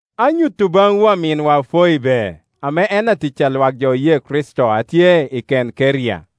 Anyuto baŋwu aminwa Foibe, ame en atic a lwak jo oye Kricito tye i Kenkeria,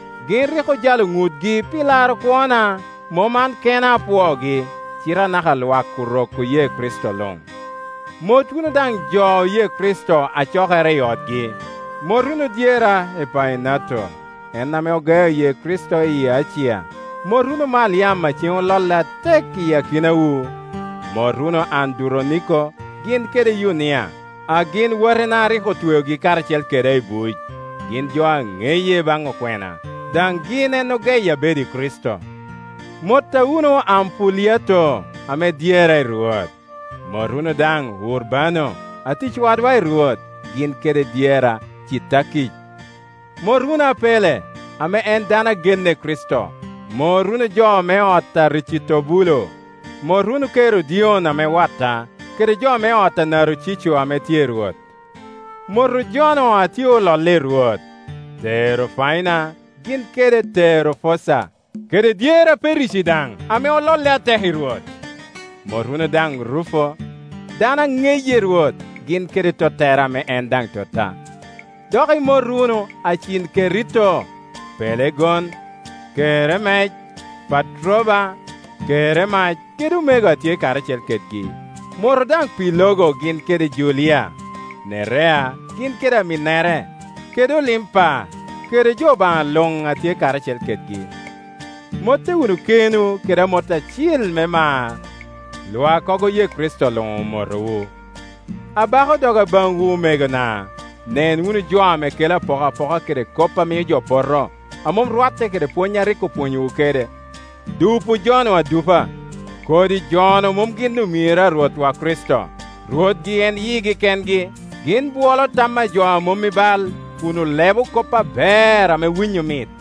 Gin rik ojalo ŋutgi pi laro kwona; mom an kena apwoogi, cite anaka lwak Orok oye Kricito luŋ. Mot wunu daŋ jo oye Kricito a cokere i otgi. Mot wunu dyera Epaenato; en ame ogeo ye Kricito i Acia. Mot wunu Maliam a ceŋ ololle atek i akinawu. Mot wunu Anduroniko gin kede Yunia, a gin watina a rik otweogi karacel keda i buc. Gin jo a ŋeye i baŋ okwena, daŋ gin en ogeya bedo i Kricito. Motta wunu Ampuliato, ame dyera i Rwot. Mot wunu daŋ Urbano atic wadwa i Rwot, gin kede dyera Citakic. Mot wunu Apelle, ame en dano a genne i Kricito. Mot wunu jo me ot a Aricitobulo. Mot wunu Kerodion ame watta, kede jo me ot a Narocico ame tye i Rwot. Motu jo-nu a tye ololle i Rwot, Terofaina gin kede Terofosa, kede dyera Perici daŋ, ame ololle atek i Rwot. Mot wunu daŋ Rufo, dano a ŋeye i Rwot, gin kede tottere, ame en daŋ totta. Dok imot wunu Acinkerito, Pelegon, Keremec, Patroba, Keremac kede omego a tye karacel kedgi. Motu daŋ Pilogo gin kede Julia, Nerea gin kede aminnere, kede Olimpa, kede jo Obaŋa luŋ a tye karacel kedgi. Motte wunu kenwu kede amot acil me mar. Lwakkogo oye Kricito luŋ omotowu. Abako doga baŋwu, omegona, nen wunu jo ame kelo apokapoka kede kop a mio jo poto, a mom rwatte kede pwony a rik opwonyowu kede. Dupu jo-nu adupa. Kodi jo-nu mom gin omiro a Rwotwa Kricito; rwotgi en yigi kengi. Gin bwolo tam a jo a mom i bal, kun olebo kop aber ame winyo mit.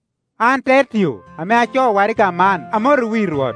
An Tertio ame acoo waraga man amotowu i Rwot.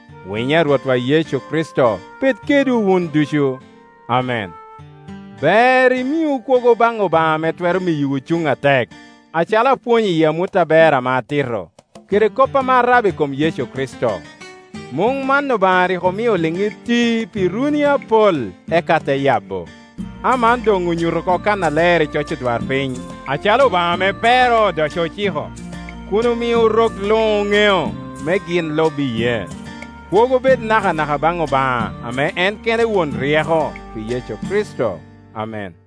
Winyo a Rwotwa Yecu Kricito bed kedwu wun ducu. Amen.] Ber imiu kwogo baŋ Obaŋa ame twero miyowu cuŋ atek, acalo apwonyo i amut aber ame atito, kede kop ame arabo i kom Yecu Kricito. Muŋ man Obaŋa rik omio oliŋ iti pi runi apol, eka te yabo. A man doŋ onyuto oko kannaler i coc odwarpiny acalo Obaŋa ame pero odoco ociko, kun omio rok luŋ oŋeo, me gin lub iyee. Kwogo bed nakanaka baŋ Obaŋa, ame en kene won ryeko, pi Yecu Kricito. Amen.